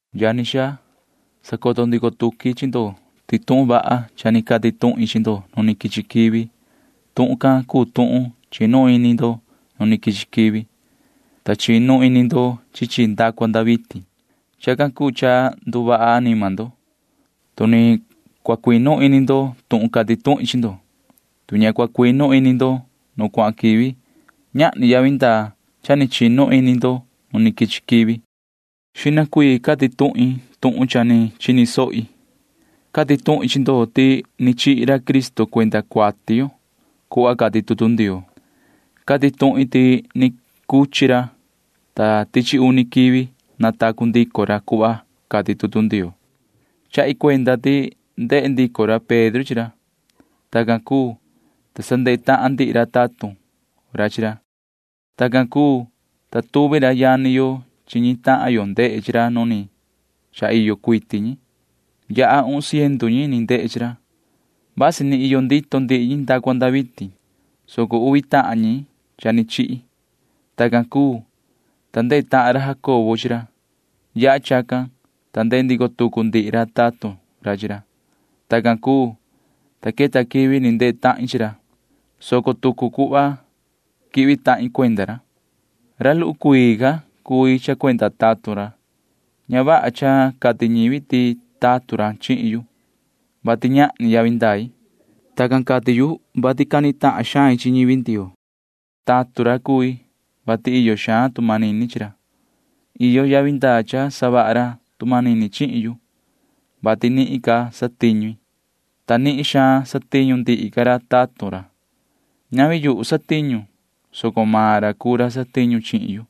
Yani xaa, sacoto ndico tuqui chi ndo ti tuhun vaha cuu cha ni cati tuhin chi ndo nu quichi quivi. Tuhun can cuu tuhun chinu ini ndo nu quichi quivi, ta chinu ini ndo chi chi nda cua nda vitin. Chacan cuu cha nduvaha anima ndo, tu ni cua cuinu ini ndo tuhun cati tuhin chi ndo. Tu ña cua cuinu ini ndo nu cuahan quivi, ñahni yavi ndaa cha ni chinu ini ndo nu quichi quivi. Xihna cuii cati tuhin tuhun cha ni chini sohi. Cati tuhin chi ndo ti ni chihi ra Cristo cuenda cuati yo cuhva cati tutu Ndioo. Cati tuhin ti ni cuchi ra, ta tichi uni quivi natacu ndico ra cuhva cati tutu Ndioo. Chahi cuenda ti ndehe ndico ra Pedro chi ra. Tacan cuu, ta sa ndehe tahan ndihi ra tatun ra chi ra. Tacan cuu, ta tuvi ra yani yo chi ñi tahan yo ndehe chi ra nu ni cha iyo cuiti ñi. Yaha uhun ciendu ñi ni ndehe chi ra. Vasi ni iyo ndito ndihi ñi nda cua nda vitin, soco uvi tahan ñi cha ni chihi. Tacan cuu, ta ndehe tahan ra Jacobo chi ra. Yaha chacan, ta ndehe ndico tucu ndihi ra tatun ra chi ra. Tacan cuu, ta queta quivi ni ndehe tahin chi ra, soco tucu cuhva quihvi tahin cuenda ra. Ra luhu cuii ca cui cha cuenda tatun ra. Ña vaha cha cati ñivi ti tatun ra chihin yu, vati ñahni yavi ndai. Tacan cati yu, vati cani tahan xain chi ñivi Ndioo. Tatun ra cui, vati iyo xaan tu manini chi ra. Iyo yavi ndaa cha savaha ra tu manini chihin yu, vati nihin ca satiñu i, ta ña nihin xaan satiñu ndihi ca ra tatun ra. Ñavi yuhu satiñu, soco maan ra cuu ra satiñu chihin yu,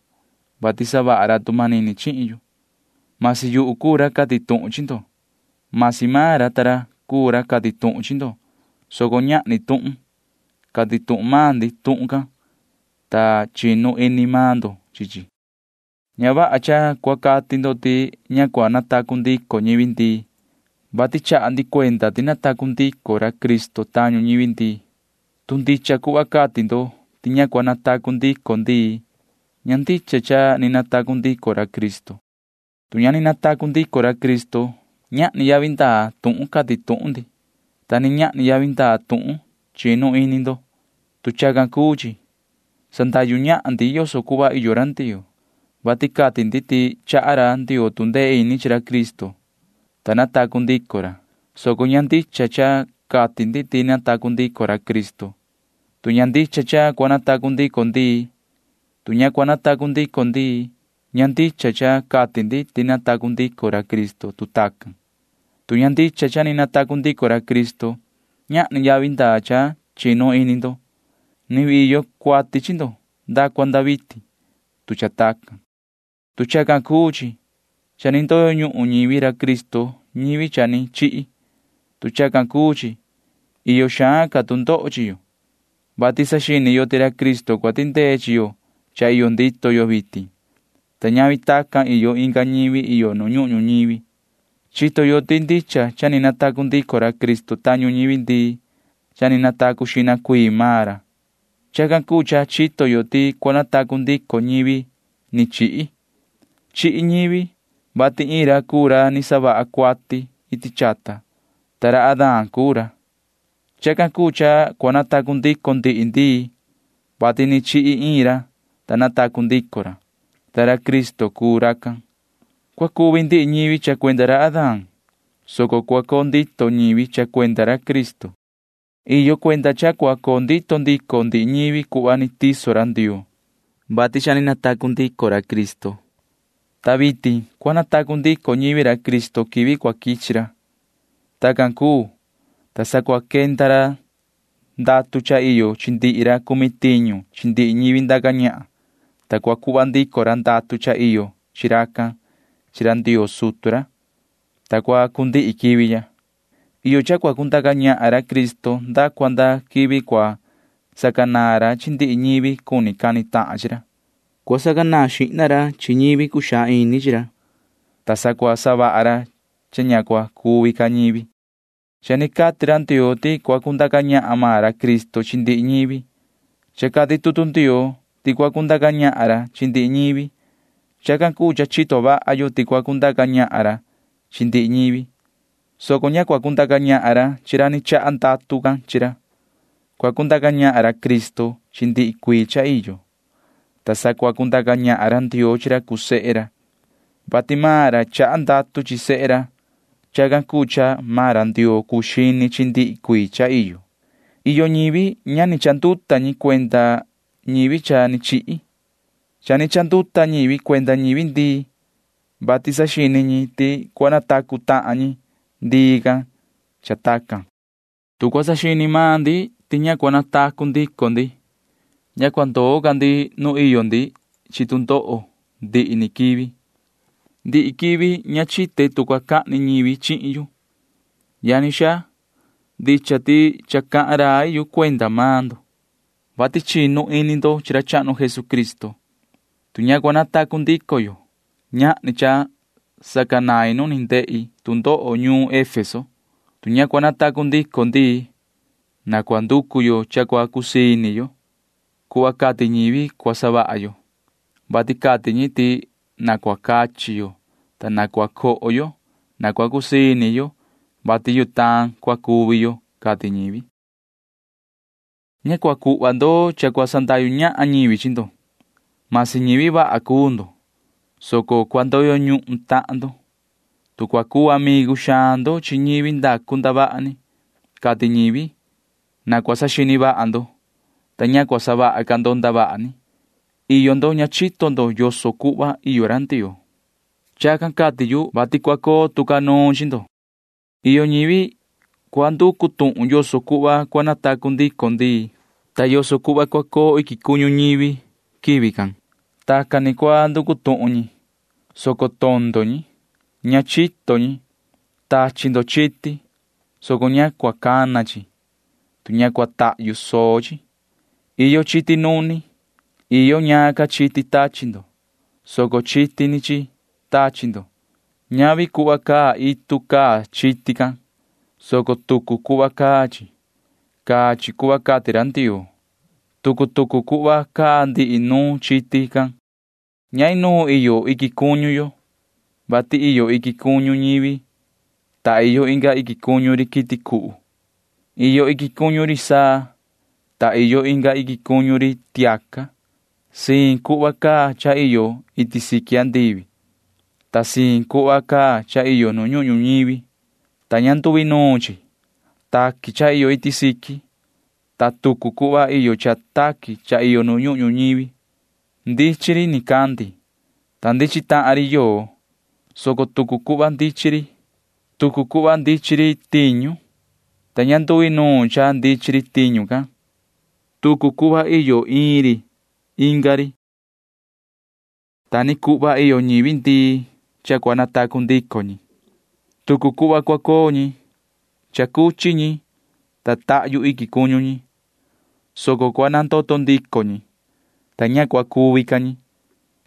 vati savaha ra tu manini chihin yu. Masi yuhu cuu ra cati tuhun chi ndo, masi maan ra ta ra cuu ra cati tuhun chi ndo, soco ñahni tuhun. Cati tuhun maan ndi tuhun can, ta chinu ini maan ndo chi chi. Ña vaha cha cua cati ndo ti ña cua natacu ndico ñivi ndii, vati chaha ndi cuenda ti ni natacu ndico ra Cristo tañu ñivi ndii. Tu ndicha cuhva cati ndo ti ña cua natacu ndico ndii, ña ndicha cha ni natacu ndico ra Cristo. Tu ña ni natacu ndico ra Cristo, ñahni yavi ndaa tuhun cati tuhun ndi, ta ni ñahni yavi ndaa tuhun chinu ini ndo. Tu chacan cuu chi, sandahyu ñahan ndi yoso cuhva iyo ra Ndioo, vati cati ndi ti chaha ra Ndioo tu ndee ini chi ra Cristo, ta natacu ndico ra, soco ña ndicha cha cati ndi ti ni natacu ndico ra Cristo, tu ña ndicha cha cua natacu ndico ndii. Tu ña cua natacu ndico ndii, ña ndicha cha cati ndi ti ni natacu ndico ra Cristo, tu tacan. Tu ña ndicha cha ni natacu ndico ra Cristo, ñahni yavi ndaa cha chinu ini ndo. Ni vii iyo cuati chi ndo nda cua nda vitin, tu cha tacan. Tu chacan cuu chi, cha ni ndoyo ñuhun ñivi ra Cristo ñivi cha ni chihi. Tu chacan cuu chi, iyo xaan ca tu ndoho chi yo, vati saxini yo ti ra Cristo cua tindee chi yo cha iyo ndito yo vitin, ta ñavi tacan iyo inga ñivi iyo nu ñuhun ñuñivi. Chito yo ti ndicha cha ni natacu ndico ra Cristo tañu ñivi ndii. Cha ni natacu xihna cuii maan ra. Chacan cuu cha chito yo ti cua natacu ndico ñivi ni chihi. Chihi ñivi, vati iin ra cuu ra ni savaha cuati iti chata, [ta ra Adán cuu ra]. Chacan cuu cha cua natacu ndico ndihi ndii, vati ni chihi iin ra, ta natacu ndico ra, [ta ra Cristo cuu racan]. Cua cuvi ndihi ñivi cha cuenda ra Adán, soco cua coo ndito ñivi cha cuenda ra Cristo. Iyo cuenda cha cua coo ndito ndico ndihi ñivi cuhva ni tiso ra Ndioo. Xihna ca cha ni natacu ndico ra Cristo, ta vitin ni cua natacu ndico ñivi ra Cristo quivi cua quichi ra. Tacan cuu, ta sa cua quenda ra ndatu cha iyo chi ndihi ra cumi tiñu chi ndihi ñivi ndaca ñahan, ta cua cuhva ndico ra ndatu cha iyo chi racan chi ra Ndioo sutu ra, ta cua cundihi quivi ya. Iyo cha cua cundaca ñahan ra Cristo nda cua nda quivi cua sacanaan ra chi ndihi ñivi cuni cani tahan chi ra. Cua sacanaan xihna ra chi ñivi cuxaan ini chi ra, ta sa cua savaha ra cha ña cua cuvi ca ñivi. Cha ni cati ra Ndioo ti cua cundaca ñahan maan ra Cristo chi ndihi ñivi. Cha cati tutu Ndioo ti cua cundaca ñahan ra chi ndihi ñivi. Chacan cuu cha chito vaha yo ti cua cundaca ñahan ra chi ndihi ñivi, soco ña cua cundaca ñahan ra chi ra ni chaha ndatu can chi ra. Cua cundaca ñahan ra Cristo chi ndihi cuii cha iyo, ta sa cua cundaca ñahan ra Ndioo chi ra cuu sehe ra, vati maan ra chaha ndatu chi sehe ra. Chacan cuu cha maan ra Ndioo cuu xini chi ndihi cuii cha iyo. Iyo ñivi cha ni chanduta ñi cuenda ñivi cha ni chihi. Cha ni chanduta ñivi cuenda ñivi ndii, vati saxini ñi ti cua natacu tahan ñi ndii can cha tacan. Tu cua saxini maan ndi ti ña cua natacu ndico ndi, ña cua ndoo ca ndi nu iyo ndi chi tu ndoho ndihi ni quivi. Ndihi quivi ña chite tu cua cahni ñivi chihin yu. Yani xaa, ndicha ti cha cahan rai yu cuenda maan ndo, vati chinu ini ndo chi ra chahnu Jesucristo. Tu ña cua natacu ndico yo, ñahni cha sacanain nu ni ndehi tu ndoho ñuun Efeso. Tu ña cua natacu ndico ndii, na cua nducu yo cha cua cusii ini yo. Cuhva cati ñivi cua savaha yo, vati cati ñi ti na cua cachi yo, ta na cua coho yo. Na cua cusii ini yo, vati yutaan cua cuvi yo, cati ñivi. Ña cua cuhva ndo cha cua sandahyu ñahan ñivi chi ndo. Masi ñivi vaha cuu ndo, soco cua ndoyo ñuhun tahan ndo, tu cua cuu amigu xaan ndo chi ñivi ndacu ndavaha ni, cati ñivi. Na cua saxini vaha ndo, ta ña cua savaha ca ndo ndavaha ni. Iyo ndo ña chito yoso cuhva iyo ra Ndioo. Chacan cati yu, vati cua coo tu ca nuun chi ndo. Iyo ñivi cua nducu tuhun yoso cuhva cua natacu ndico ndii, ta yoso cuhva cua coo iquin cuñu ñivi quivi can. Tacan ni cua nducu tuhun ñi, soco tondo ñi. Ña chito ñi. Tachi ndo chiti, soco ña cua cana chi, tu ña cua tahyu soo chi. Iyo chiti nuni. Iyo ñaan ca chiti tachi ndo, soco chiti ni chi tachi ndo. Ñavi cuhva caa itu caa chiti can, soco tucu cuhva caa chi. Caa chi cuhva cati ra Ndioo. Tucu tucu cuhva caa ndihi nuun chiti can. Ña inuun iyo iquin cuñu yo, vati iyo iquin cuñu ñivi, ta iyo inga iquin cuñu ri quiti cuhu. Iyo iquin cuñu ri saa, ta iyo inga iquin cuñu ri tiaca. Siin cuhva caa cha iyo iti siqui andivi, ta siin cuhva caa cha iyo nu ñuhun ñuñivi, ta ña nduinuun chi. Taqui cha iyo iti siqui, ta tucu cuhva iyo cha taqui cha iyo nu ñuhun ñuñivi. Ndichin ri nicandi, ta ndichin tahan ri yoo, soco tucu cuhva ndichin ri. Tucu cuhva ndichin ri tiñu, ta ña nduinuun cha ndichin ri tiñu can. Tucu cuhva iyo iin ri inga ri. Ta ni cuhva iyo ñivi ndii cha cua natacu ndico ñi. Tucu cuhva cua coo ñi. Cha cuchi ñi, ta tahyu iquin cuñu ñi, soco cua nandoto ndico ñi, ta ña cua cuvi ca ñi.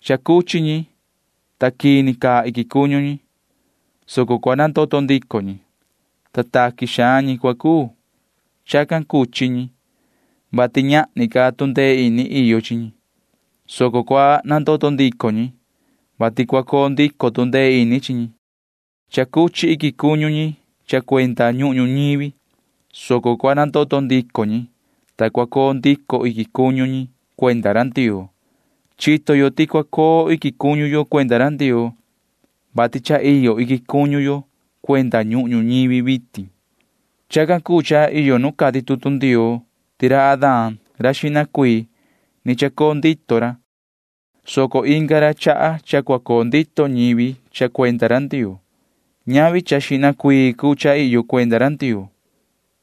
Cha cuchi ñi, ta quini caa iquin cuñu ñi, soco cua nandoto ndico ñi, ta taqui xaan ñi cua cuu. Cha cuchi ñi, vati ñahni ca tu ndee ini iyo chi ñi, soco cua nandoto ndico ñi, vati cua coo ndico tu ndee ini chi ñi. Cha cuchi iquin cuñu ñi cha cuenda ñuhun ñuñivi, soco cua nandoto ndico ñi, ta cua coo ndico iquin cuñu ñi cuenda ra Ndioo. Chito yo ti cua coo iquin cuñu yo cuenda ra Ndioo, vati cha iyo iquin cuñu yo cuenda ñuhun ñuñivi vitin. Chacan cuu cha iyo nu cati tutu Ndioo ti ra Adán ra xihna cuii―ni chacoo ndito ra, soco inga ra chaha cha cua coo ndito ñivi cha cuenda ra Ndioo. Ñavi cha xihna cuii cuu cha iyo cuenda ra Ndioo.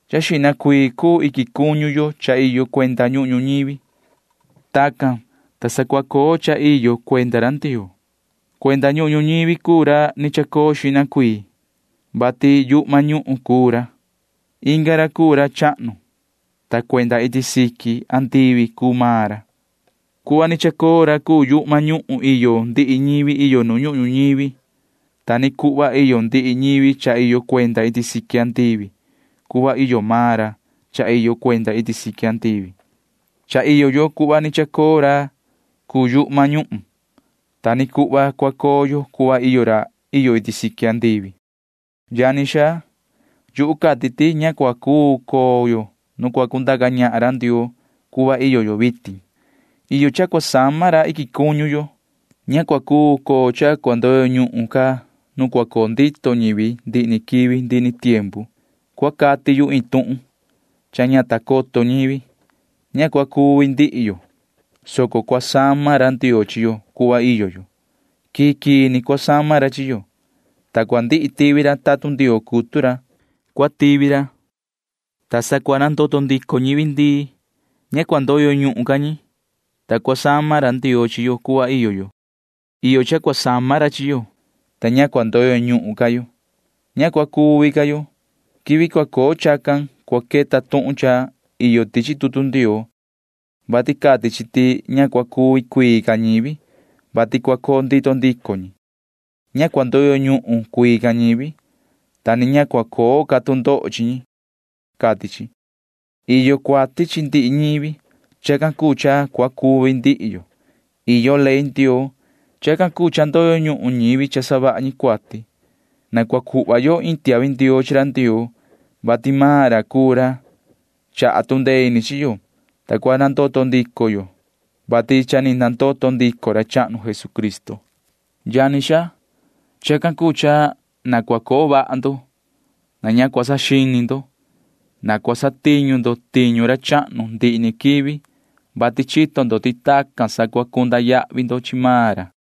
Cha xihna cuii cuu iquin cuñu yo cha iyo cuenda ñuhun ñuñivi. Tacan, ta sa cua coo cha iyo cuenda ra Ndioo. Cuenda ñuhun ñuñivi cuu ra ni chacoo xihna cuii, vati yuhma ñuhun cuu ra. Inga ra cuu ra chahnu, ta cuenda iti siqui andivi cuu maan ra. Cuhva ni chacoo ra cuu yuhma ñuhun iyo ndihi ñivi iyo nu ñuhun ñuñivi. Ta ni cuhva iyo ndihi ñivi cha iyo cuenda iti siqui andivi cuhva iyo maan ra cha iyo cuenda iti siqui andivi. Cha iyo yo cuhva ni chacoo ra cuu yuhma ñuhun. Ta ni cuhva cua coo yo cuhva iyo ra iyo iti siqui. Yani xaa, yuhu cati ti ña cua cuu coo yo nu cua cundaca ñahan ra Ndioo cuhva iyo yo vitin. Iyo cha cua sama ra iquin cuñu yo. Ña cua cuu coo cha cua ndoyo ñuhun ca nuun cua coo ndito ñivi ndihi ni quivi ndihi ni tiempu. Cua cati yu iin tuhun cha ña ta coto ñivi. Ña cua cuvi ndihi yo, soco cua sama ra Ndioo chi yo cuhva iyo yo. Quii quii ni cua sama ra chi yo, ta cua ndihi tivi ra tatun Ndioo cutu ra. Cua tivi ra, ta sa cua nandoto ndico ñivi ndii. Ña cua ndoyo ñuhun ca ñi, ta cua sama ra Ndioo chi yo cuhva iyo yo. Iyo cha cua sama ra chi yo, ta ña cua ndoyo ñuhun ca yo. Ña cua cuvi ca yo. Quivi cua coo chacan cua queta tuhun cha iyo tichi tutu Ndioo, vati cati chi ti ña cua cuvi cuii ca ñivi, vati cua coo ndito ndico ñi. Ña cua ndoyo ñuhun cuii ca ñivi, ta ni ña cua coo ca tu ndoho chi ñi, cati chi. Iyo cuati chi ndihi ñivi. Chacan cuu cha cua cuvi ndihi yo. Iyo ley Ndioo. Chacan cuu cha ndoyo ñuhun ñivi cha savaha ñi cuati. Na cua cuhva yo iin tiahvi ndioo chi ra Ndioo, vati maan ra cuu ra chaha tu ndee ini chi yo, ta cua nandoto ndico yo, vati cha ni nandoto ndico ra chahnu Jesucristo. Yani xaa, chacan cuu cha na cua coo vaha ndo. Na ña cua saxini ndo. Na cua satiñu ndo tiñu ra chahnu ndihi ni quivi, vati chito ndo ti tacan sa cua cunda yahvi ndo chi maan ra.